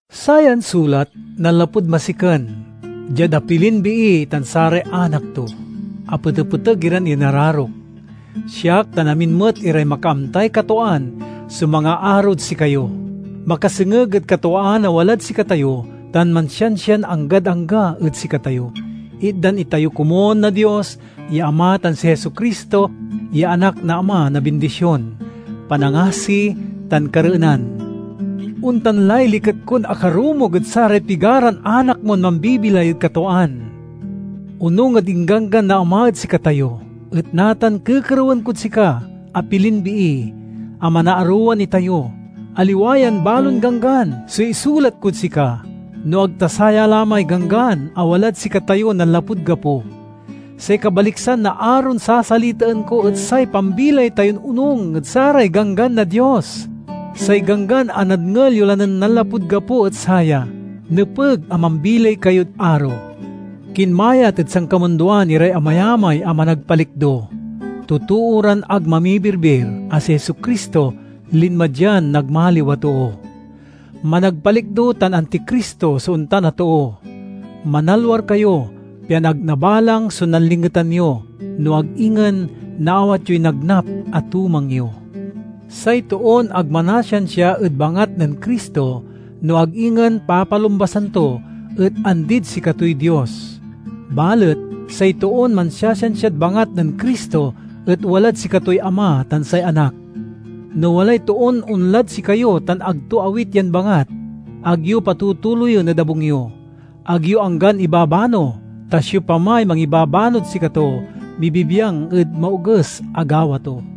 Sayan sulat nanlapud Masiken— Diad apilin Bii tan saray anak to, a petepeteg iran inararok. Siak tan amin met iray makaamtay katwaan so mangaarod sikayo, makasengeg ed katwaan a walad sikatayo tan mansiansian anggad angga ed sikatayo. Itdan itayo komun na Dios ya Ama tan si Jesu-Cristo ya Anak na Ama na bindision, panangasi, tan kareenan. Ontan lay liket kon akarumog ed saray pigaran anak mon mambibilay ed katwaan, onung ed ingganggan na Ama ed sikatayo. Et natan kekerewen kod sika, apilin Bii, a manaarowan itayo. Aliwa yan balon ganggan so isulat kod sika, no ag ta saya la may ganggan a walad sikatayo nanlapud gapo. Say kabaliksan na aron sasalitaen ko et say pambilay tayon onung ed saray ganggan na Dios. Say ganggan a nadngel yo lan nanlapud gapo et saya: nepeg a mambilay kayod aro. Kinmayat ed sankamundoan iray amayamay a managpalikdo—totoo ran ag mamimirbir a si Jesu-Cristo linma dian nagmaliw a too. Managpalikdo tan Anticristo so ontan a too. Manalwar kayo, pian ag nabalang so nanlingetan yo, no ag ingen naawat yoy nagnap a tumang yo. Say toon ag manasiansia ed bangat nen Cristo, no ag ingen papalumbasan to, et andid sikatoy Dios. Balet say toon mansiasiansiad bangat nen Cristo et walad sikatoy Ama tan say Anak. No walay toon onlad sikayo tan ag to awit yan bangat, ag yo patutuloyen ed abung yo; ag yo anggan ibabano. Ta siopamay mangibabanod sikato, mibibiang ed maoges a gawa to.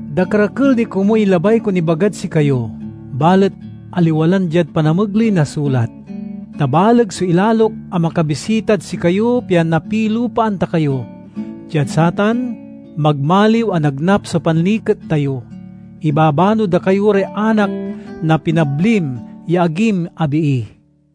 Dakerakel ni komuy labay kon ibagad sikayo, balet aliwa lan diad panamegley na sulat, ta baleg so ilalok a makabisitad sikayo pian napilupaan ta kayo. Diad satan, magmaliw a nagnap so panliket tayo. Ibabano da kayo ray anak na pinablim ya agim a Bii.